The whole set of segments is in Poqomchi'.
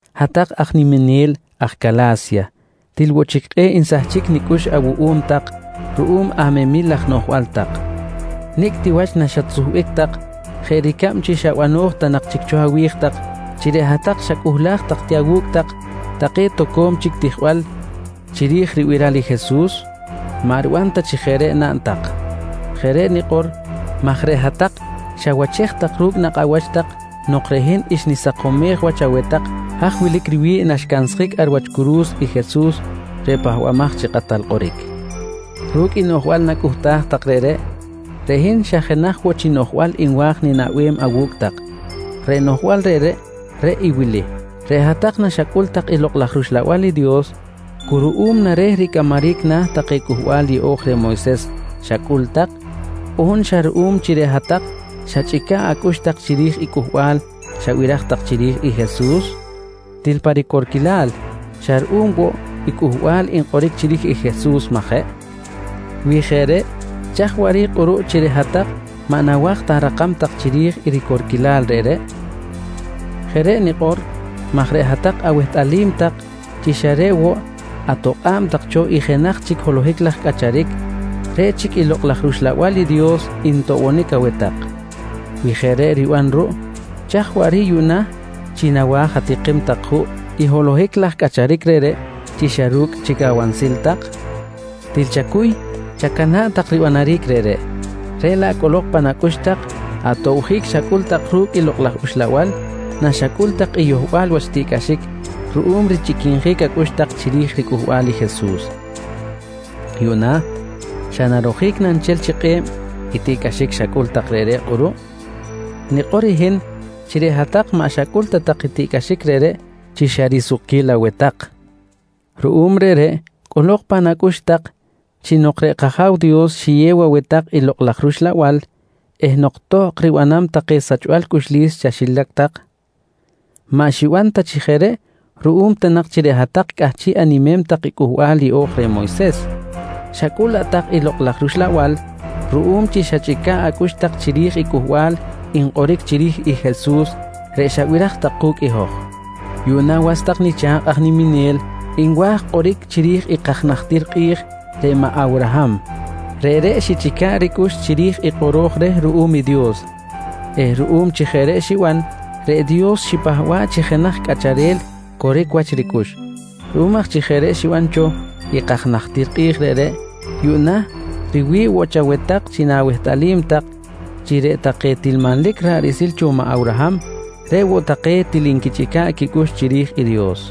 Hat-tak aj niminel aj Cala̱sya til woꞌ chic kꞌe̱ꞌ nsahchic nicꞌux awuꞌum tak ruꞌum amemil laj noꞌjbal tak. Nicꞌ ti wach naxatsuhbic tak jeꞌ ricab chi xa bano̱j ta nak chic cho awi̱j tak chi reꞌ hat-tak xacꞌuhlaj tak ti awu̱cꞌ tak take toco̱m chic tijbal chiri̱j ribiral i Jesus? Maꞌ riban ta chi jeꞌ reꞌ naꞌn tak! Jeꞌ reꞌ nikꞌor maj reꞌ hat-tak xawachej ru̱cꞌ nakꞌ awach tak nok reꞌ hin xnisakomej wach aweh tak haj wilic riwi̱ꞌ naxcansjic ar wach curu̱s i Jesus reꞌ Pahbamaj chi Kꞌatal Kꞌoric. Ru̱cꞌ noꞌjbal nacꞌuhtaj tak reꞌreꞌ, reꞌ hin xa jenaj woꞌ chi noꞌjbal nwa̱j ninaꞌbem awu̱cꞌ tak, reꞌ noꞌjbal reꞌreꞌ, reꞌ i wili: Reꞌ hat-tak naxacꞌul tak i Lokꞌ laj rUxlabal i Dios, cu ruꞌum na reh ricꞌamaric na̱ take Cꞌuhbal Yeꞌo̱j reh Moyses xacꞌul tak on xa ruꞌum chi reꞌ hat-tak xachꞌica̱ꞌ acꞌux tak chiri̱j i cꞌuhbal xabiraj tak chiri̱j i Jesus? Til pa ricorquilal, xa ruꞌum woꞌ i cꞌuhbal nkꞌoric chiri̱j i Jesus, maꞌ jeꞌ? Wi jeꞌ reꞌ chaj chic waꞌric kꞌuruꞌ chi reꞌ hat-tak maꞌ nawa̱j ta arakam tak chiri̱j i ricorquilal reꞌreꞌ? Jeꞌ reꞌ nikꞌor maj reꞌ hat-tak awehtꞌalim tak chi xa reꞌ woꞌ atokꞌa̱b tak cho i jenaj chic holohic laj cꞌacharic, reꞌ chic i Lokꞌ laj rUxlabal i Dios ntoꞌbonic aweh tak. Wi jeꞌ reꞌ riban ruꞌ, chaj chic waꞌric yuꞌna chi nawa̱j atikim tak juꞌ i holohic laj cꞌacharic reꞌreꞌ chi xa ru̱cꞌ chic awansil tak? Til chacuy chacana̱ꞌ tak ribanaric reꞌreꞌ. Reꞌ laꞌ cꞌolok pan acꞌux tak atobjic xacꞌul tak ru̱cꞌ i Lokꞌ laj Uxlabal naxacꞌul tak i yohbal wach tiꞌcꞌaxic ruꞌum richꞌiquinjic acꞌux tak chiri̱j ricꞌuhbal i Jesus. Yuꞌna xa narojic na nchel chi kꞌe̱b i tiꞌcꞌaxic xacꞌul tak reꞌreꞌ kꞌuruꞌ? Nanikꞌor i hin chi reꞌ hat-tak maꞌ xacꞌul ta tak i tiꞌcꞌaxic reꞌreꞌ chi xa risukquil aweh tak. Ruꞌum reꞌreꞌ cꞌolok pan acꞌux tak chi nok reꞌ kAja̱w Dios xiyew aweh tak i Lokꞌ laj rUxlabal eh nok tohkꞌ riban take sachbal cꞌuxlis chaxilac tak, maꞌ xiban ta chi jeꞌ reꞌ ruꞌum ta nak chi reꞌ hat-tak cꞌahchiꞌ animem tak i Cꞌuhbal Yeꞌo̱j reh Moyses, xacꞌul laꞌ tak i Lokꞌ laj rUxlabal ruꞌum chi xachꞌica̱ꞌ acꞌux tak chiri̱j i cꞌuhbal nkꞌoric chiri̱j i Jesus, reꞌ xabiraj tak ku̱cꞌ i hoj. Yuꞌna was tak nicha̱kꞌ aj niminel nwa̱j kꞌoric chiri̱j i kaj najtir kꞌi̱j reꞌ maꞌ Awraham. Reꞌreꞌ xichꞌica̱ꞌ ricꞌux chiri̱j i kꞌoro̱j reh ruꞌum i Dios eh ruꞌum chi jeꞌ reꞌ xiban, reꞌ Dios xipahba̱ꞌ chi jenaj cꞌacharel coric wach ricꞌux. Ruꞌum aj chi jeꞌ reꞌ xiban cho i kaj najtir kꞌi̱j reꞌreꞌ, yuꞌna riwi̱ꞌ woꞌ chaweh tak chi na̱wehtꞌalim tak chi reꞌ take til manlic ra̱ꞌ riꞌsil cho maꞌ Awraham, reꞌ woꞌ take til nquichꞌica̱ꞌ quicꞌux chiri̱j i Dios.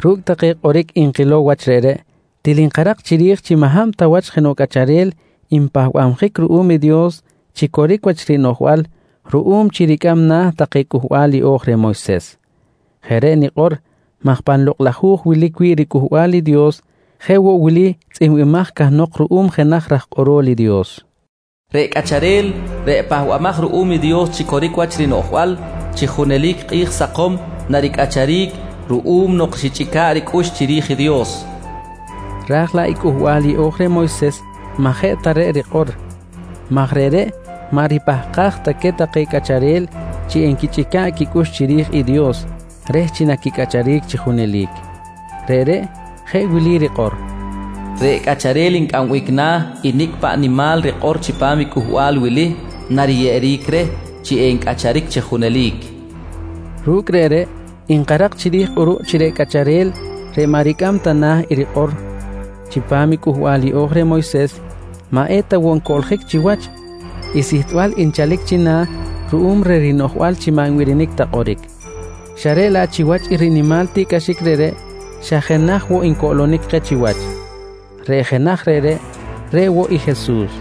Ru̱cꞌ take kꞌoric nkilow wach reꞌreꞌ, til nkarak chiri̱j chi maꞌ hab ta wach jenoꞌ cꞌacharel npahbabjic ruꞌum i Dios chi coric wach rinoꞌjbal ruꞌum chi ricꞌam na̱ take Cꞌuhbal Yeꞌo̱j reh Moyses. Jeꞌ reꞌ nikꞌor maj pan Lokꞌ laj Hu̱j wilic wi̱ꞌ riCꞌuhbal i Dios jeꞌ woꞌ wili tzꞌihmbimaj cahnok ruꞌum jenaj raj kꞌorol i Dios: “Reꞌ cꞌacharel reꞌ pahbamaj ruꞌum i Dios chi coric wach rinoꞌjbal chi junelic kꞌi̱j sakom naricꞌacharic ruꞌum nok xichꞌica̱ꞌ ricꞌux chiri̱j i Dios, nqui tzꞌihmbimaj cahnok. Raj laꞌ i Cꞌuhbal Yeꞌo̱j reh Moyses maꞌ jeꞌ ta reꞌ rikꞌor maj reꞌreꞌ maꞌ ripahkaj ta queh take cꞌacharel chi enquichꞌica̱ꞌ quicꞌux chiri̱j i Dios reh chi naquicꞌacharic chi junelic. Reꞌreꞌ jeꞌ wili rikꞌor: “Reꞌ cꞌacharel ncꞌambic na̱ i nicꞌ paꞌ nimal rikꞌor chipam i cꞌuhbal wili, nariyeꞌeric reh chi encꞌacharic chi junelic, nqui rikꞌor. Ru̱cꞌ reꞌreꞌ nkarak chiri̱j kꞌuruꞌ chi reꞌ cꞌacharel reꞌ maꞌ ricꞌam ta na̱ i rikꞌor chipam i Cꞌuhbal Yeꞌo̱j reh Moyses, maꞌ eta woꞌ ncoꞌljic chiwach i sihtbal nchalic china̱ ruꞌum reh rinoꞌjbal chi maꞌ nbirinic ta kꞌoric. Xa reꞌ laꞌ chiwach i rinimal tiꞌcꞌaxic reꞌreꞌ xa jenaj woꞌ ncoꞌlonic keh chiwach. Reꞌ jenaj reꞌreꞌ, reꞌ woꞌ i Jesus.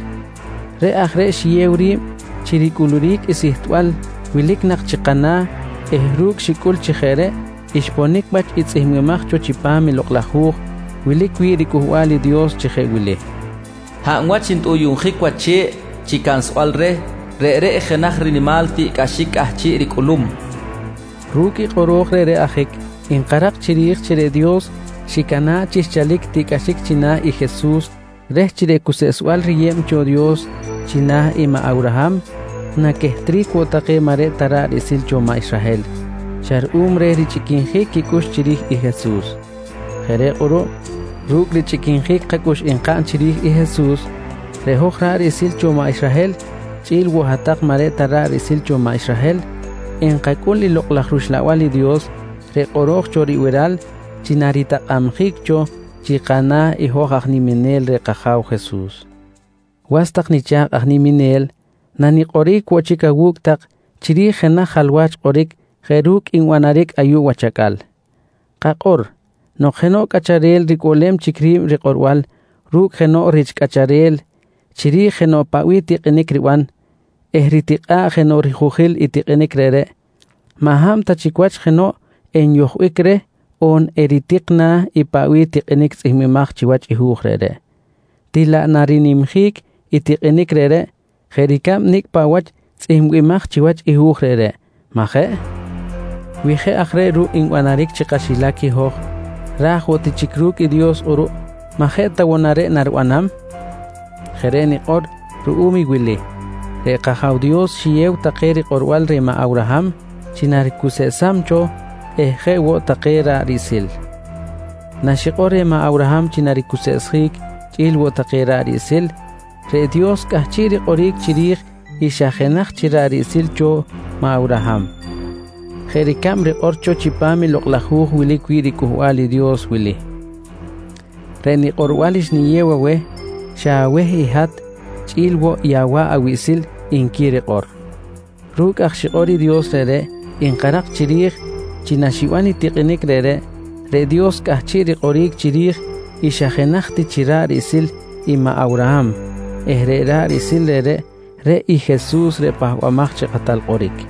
Reꞌ aj reꞌ xiyew ri̱b chi ricꞌuluric i sihtbal wilic nak chi kana̱ eh ru̱cꞌ xicꞌul chi jeꞌ reꞌ xponic wach i tzꞌihmbimaj cho chipam i Lokꞌ laj Hu̱j wilic wi̱ꞌ i riCꞌuhbal i Dios chi jeꞌ wili: “Hab wach ntꞌuyuꞌnjic wach che̱ꞌ chi cansbal reh, reꞌreꞌ jenaj rinimal tiꞌcꞌaxic cꞌahchiꞌ ricꞌulum, nqui tzꞌihmbimaj cho. Ru̱cꞌ i kꞌoro̱j reꞌreꞌ ajic nkarak chiri̱j chi reꞌ Dios xicana̱ꞌ chi xchalic i tiꞌcꞌaxic china̱ i Jesus reh chi reꞌ cuseꞌsbal riyeb cho Dios china̱ i maꞌ Awraham naquehtric woꞌ take maꞌ reꞌ ta ra̱ꞌ riꞌsil cho maꞌ Israhel xa ruꞌum reh richꞌiquinjic quicꞌux chiri̱j i Jesus. Jeꞌ reꞌ kꞌuruꞌ ru̱cꞌ richꞌiquinjic kacꞌux nkaꞌn chiri̱j i Jesus reꞌ hoj ra̱ꞌ riꞌsil cho maꞌ Israhel chꞌi̱l woꞌ hat-tak maꞌ reꞌ ta ra̱ꞌ riꞌsil cho maꞌ Israhel enkacꞌul i Lokꞌ laj rUxlabal i Dios reꞌ kꞌoro̱j cho ribiral chi naritakꞌabjic cho chi kana̱ hoj aj niminel reh i kAja̱w Jesus. Was tak nicha̱kꞌ aj niminel, nanikꞌoric woꞌ chic awu̱cꞌ tak chiri̱j jenaj jalwach kꞌoric jeꞌ ru̱cꞌ nbanaric ayuꞌ wach acꞌal. Kakꞌor, nok jenoꞌ cꞌacharel ricꞌuꞌlem chic ri̱b rikꞌorbal ru̱cꞌ jenoꞌ rich cꞌacharel chiri̱j jenoꞌ paꞌ bih tikꞌinic riban eh ritikꞌa̱ꞌ jenoꞌ rihujil i tikꞌinic reꞌreꞌ, maꞌ hab ta chic wach jenoꞌ enyojbic reh on eritik na̱ i paꞌ bih tikꞌinic tzꞌihmbimaj chiwach i hu̱j reꞌreꞌ, til laꞌ narinimjic i tikꞌinic reꞌreꞌ jeꞌ ricab nicꞌ paꞌ wach tzꞌihmbimaj chiwach i hu̱j reꞌreꞌ, majeꞌ? Wi jeꞌ aj reꞌ ruꞌ nbanaric chi kaxilac i hoj, ra̱j woꞌ ti chic ru̱cꞌ i Dios kꞌuruꞌ, maꞌ je ta woꞌ na reꞌ naribanam? Jeꞌ reꞌ nikꞌor ruꞌum i wili: Reꞌ kAja̱w Dios xiyew take rikꞌorbal reh maꞌ Awraham chi naricuseꞌsam cho eh jeꞌ woꞌ take i ra̱ꞌ riꞌsil. Naxikꞌor reh maꞌ Awraham chi naricuseꞌsjic chꞌi̱l woꞌ take ra̱ꞌ riꞌsil, reꞌ i Dios cꞌahchiꞌ rikꞌoric chiri̱j i xa jenaj chi ra̱ꞌ riꞌsil cho maꞌ Awraham, jeꞌ ricab rikꞌor cho chipam i Lokꞌ laj hu̱j wilic wi̱ꞌ riCꞌuhbal i Dios wili: “Reꞌ nikꞌorbal xniyew aweh, xa aweh i hat chꞌi̱l woꞌ i awa̱ꞌ awiꞌsil, nqui rikꞌor. Ru̱cꞌ aj xikꞌor i Dios reꞌreꞌ, nkarak chiri̱j chi naxiban i tikꞌinic reꞌreꞌ, reꞌ Dios cꞌahchiꞌ rikꞌoric chiri̱j i xa jenaj ti chi ra̱ꞌ riꞌsil i Awraham eh reꞌ ra̱ꞌ riꞌsil reꞌreꞌ, reꞌ i Jesus reꞌ Pahbamaj chi Kꞌatal Kꞌoric.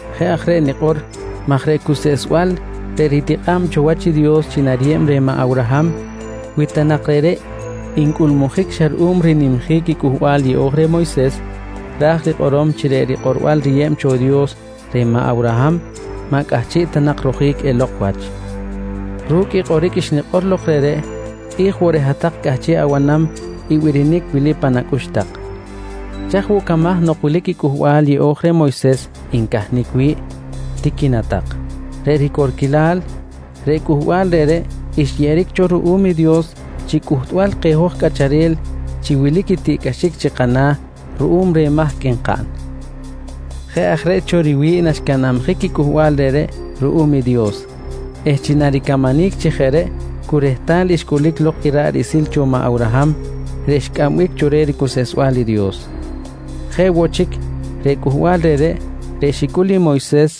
Jeꞌ aj reꞌ nikꞌor maj reꞌ cuseꞌsbal reꞌ ritikꞌa̱b cho wach i Dios chi nariyeb reh maꞌ Awraham, wi ta nak reꞌreꞌ ncꞌulmujic xa ruꞌum rinimjic i Cꞌuhbal Yeꞌo̱j reh Moyses, ra̱j rikꞌorom chi reꞌ rikꞌorbal riyeb cho Dios reh Awraham maꞌ cꞌahchiꞌ ta nak rojic elok wach. Ru̱cꞌ i kꞌoric xnikꞌor lok reꞌreꞌ, kꞌi̱j woꞌ reꞌ hat-tak cꞌahchiꞌ abanam i birinic wili pan acꞌux tak: «Chaj woꞌ camaj nok wilic i Cꞌuhbal Yeꞌo̱j reh Moyses ncahnic wi̱ꞌ? tiqui na tak. Reꞌ ricorquilal, reꞌ cꞌuhbal reꞌreꞌ xyeꞌeric cho ruꞌum i Dios chi cꞌuhtbal keh hoj cꞌacharel chi wilic i tiꞌcꞌaxic chi kana̱ ruꞌum reh mahc nkaꞌn. Jeꞌ aj reꞌ cho riwi̱ꞌ naxcanabjic i cꞌuhbal reꞌreꞌ ruꞌum i Dios eh chi naricamanic chi jeꞌ reꞌ cu rehtal xcꞌulic lok i ra̱ꞌ riꞌsil cho maꞌ Awraham reꞌ xcꞌambic cho ricuseꞌsbal i Dios. Jeꞌ woꞌ chic reꞌ cꞌuhbal reꞌreꞌ, reꞌ xicꞌul i Moyses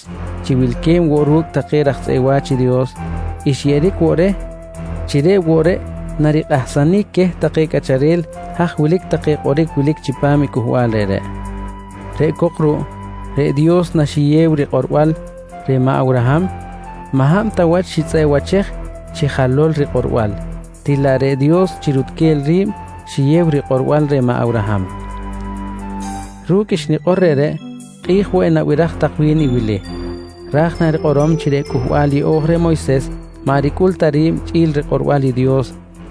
chi wilque̱b woꞌ ru̱cꞌ take raj tzꞌeꞌ wa̱ch Dios, xyeꞌeric woꞌ reh chi reꞌ woꞌ reꞌ narikꞌahsanic queh take cꞌacharel haj wilic take kꞌoric wilic chipam i cꞌuhbal reꞌreꞌ. Reꞌ cok ruꞌ reꞌ Dios naxiyew rikꞌorbal reh maꞌ Awraham, maꞌ hab ta wach xitzꞌeꞌwachej chi jalol rikꞌorbal, til laꞌ reꞌ Dios chi rutquel ri̱b xiyew rikꞌorbal reh maꞌ Awraham. Ru̱cꞌ i xnikꞌor reꞌreꞌ, kꞌi̱j woꞌ enabiraj tak wi̱n i wili: «Ra̱j na rikꞌorom chi reꞌ Cꞌuhbal Yeꞌo̱j reh Moyses maꞌ ricꞌul ta ri̱b chꞌi̱l rikꞌorbal i Dios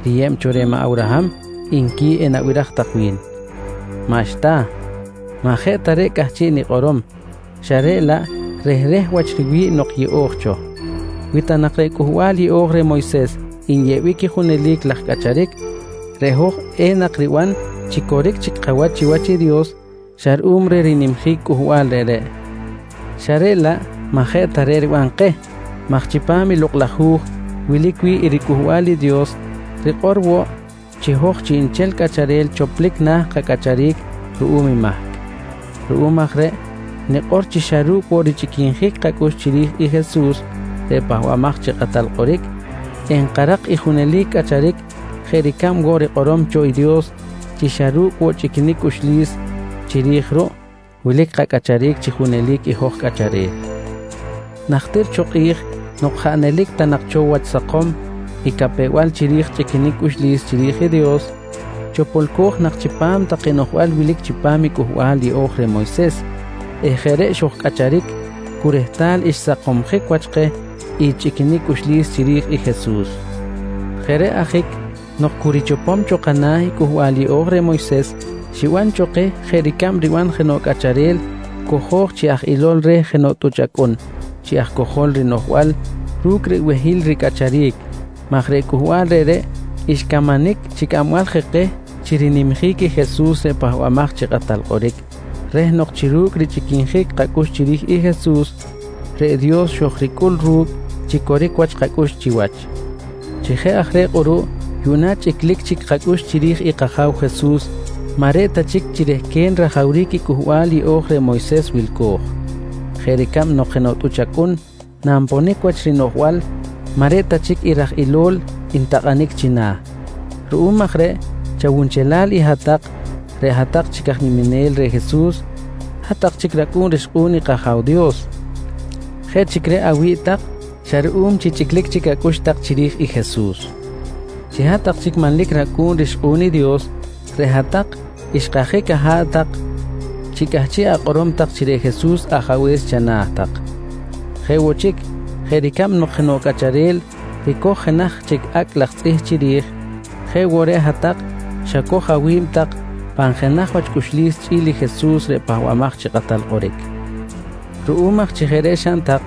riyeb cho reh maꞌ Awraham, nqui enabiraj tak wi̱n. Maꞌxta! Maꞌ jeꞌ ta reꞌ cꞌahchiꞌ nikꞌorom xa reꞌ laꞌ rehreh wach riwi̱ꞌ nok yeꞌo̱j cho. Wi ta nak reꞌ Cꞌuhbal Yeꞌo̱j reh Moyses nyeꞌbic i junelic laj cꞌacharic, reꞌ hoj enak riban chi coric chic kawach chiwach i Dios xa ruꞌum reh rinimjic cꞌuhbal reꞌreꞌ xa reꞌ laꞌ maꞌ jeꞌ ta reꞌ riban keh maj chipam i Lokꞌ laj Hu̱j wilic wi̱ꞌ i riCꞌuhbal i Dios rikꞌor woꞌ chi hoj chiꞌnchel cꞌacharel choplic na̱ kacꞌacharic ruꞌum i mahc. Ruꞌum aj reꞌ nikꞌor chi xa ru̱cꞌ woꞌ richꞌiquinjic kacꞌux chiri̱j i Jesus reꞌ Pahbamaj chi Kꞌatal Kꞌoric, enkarak i junelic cꞌacharic jeꞌ ricab woꞌ rikꞌorom cho i Dios chi xa ru̱cꞌ woꞌ chꞌiquinic cꞌuxlis chiri̱j ruꞌ wilic kacꞌacharic chi junelic i hoj cꞌacharel. Najtir cho kꞌi̱j nok jaꞌ nelic ta nak cho wach sakom i capew-bal chiri̱j i chꞌiquinic cꞌuxlis chiri̱j i Dios, chopolco̱j nak chipam take noꞌjbal wilic chipam i Cꞌuhbal Yeꞌo̱j reh Moyses eh jeꞌ reꞌ xojcꞌacharic cu rehtal xsakomsjic wach keh i chꞌiquinic cꞌuxlis chiri̱j i Jesus. Jeꞌ reꞌ ajic nok cu richopom cho kana̱ i Cꞌuhbal Yeꞌo̱j reh Moyses, xiban cho keh jeꞌ ricab riban jenoꞌ cꞌacharel cojo̱j chi aj ilol reh jenoꞌ tꞌuch acꞌun chi aj cojol rinoꞌjbal ru̱cꞌ ribehil ricꞌacharic maj reꞌ cꞌuhbal reꞌreꞌ xcamanic chi cꞌambal je keh chi rinimjic i Jesus reꞌ Pahbamaj chi Kꞌatal Kꞌoric reh nok chi ru̱cꞌ richꞌiquinjic kacꞌux chiri̱j i Jesus, reꞌ Dios xojricꞌul ru̱cꞌ chi coric wach kacꞌux chiwach. Chi jeꞌ aj reꞌ kꞌuruꞌ yuꞌna chi chꞌiclic chic kacꞌux chiri̱j i kAja̱w Jesus maꞌ reꞌ ta chic chi rehquen rajawric i Cꞌuhbal Yeꞌo̱j reh Moyses wilco̱j, jeꞌ ricab nok jenoꞌ tꞌuch acꞌun nanponic wach rinoꞌjbal maꞌ reꞌ ta chic i raj ilol ntakꞌanic china̱. Ruꞌum aj reꞌ chawunchelal i hat-tak reꞌ hat-tak chic aj niminel reh Jesus, hat-tak chic racꞌu̱n rixkꞌu̱n i kAja̱w Dios. Jeꞌ chic reꞌ awi̱ꞌ tak xa ruꞌum chi chꞌiclic chic acꞌux tak chiri̱j i Jesus. Chi hat-tak chic manlic racꞌu̱n rixkꞌu̱n i Dios, reꞌ hat-tak xkajic aha̱ꞌ tak chi cꞌahchiꞌ akꞌorom tak chi reꞌ Jesus Ajabe̱s chana̱ tak. Jeꞌ woꞌ chic, jeꞌ ricab nok jenoꞌ cꞌacharel ricoj jenaj chic acꞌ laj tzꞌih chiri̱j, jeꞌ woꞌ reꞌ hat-tak xacoj awi̱b tak pan jenaj wach cꞌuxlis chꞌi̱l i Jesus reꞌ Pahbamaj chi Kꞌatal Kꞌoric. Ruꞌum aj chi jeꞌ reꞌ xaꞌn tak,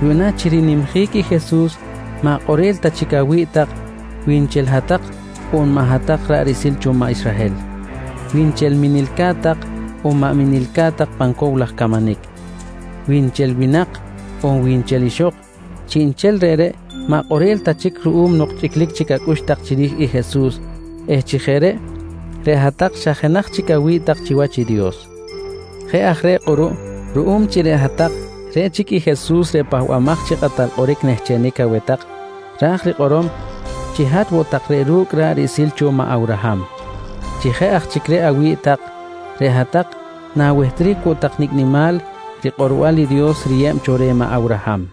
yuꞌna chi rinimjic i Jesus maꞌ kꞌorel ta chic awi̱ꞌ tak wi nchel hat-tak on maꞌ hat-tak ra̱ꞌ riꞌsil cho maꞌ Israhel, wi nchel minilcat tak on maꞌ minilcat tak pan cow laj camanic, wi nchel winak on wi nchel ixok; chiꞌnchel reꞌreꞌ maꞌ kꞌorel ta chic ruꞌum nok chꞌiclic chic acꞌux tak chiri̱j i Jesus eh chi jeꞌ reꞌ, reꞌ hat-tak xa jenaj chic awi̱ꞌ tak chiwach i Dios. Jeꞌ aj reꞌ kꞌuruꞌ ruꞌum chi reꞌ hat-tak reꞌ chic i Jesus reꞌ Pahbamaj chi Kꞌatal Kꞌoric nehchenic aweh tak, ra̱j rikꞌorom chi hat woꞌ tak reꞌ ru̱cꞌ ra̱ꞌ riꞌsil cho maꞌ Awraham. Chi jeꞌ aj chic reꞌ awi̱ꞌ tak, reꞌ hat-tak na̱wehtric woꞌ tak nicꞌ nimal rikꞌorbal i Dios riyeb cho reh maꞌ Awraham.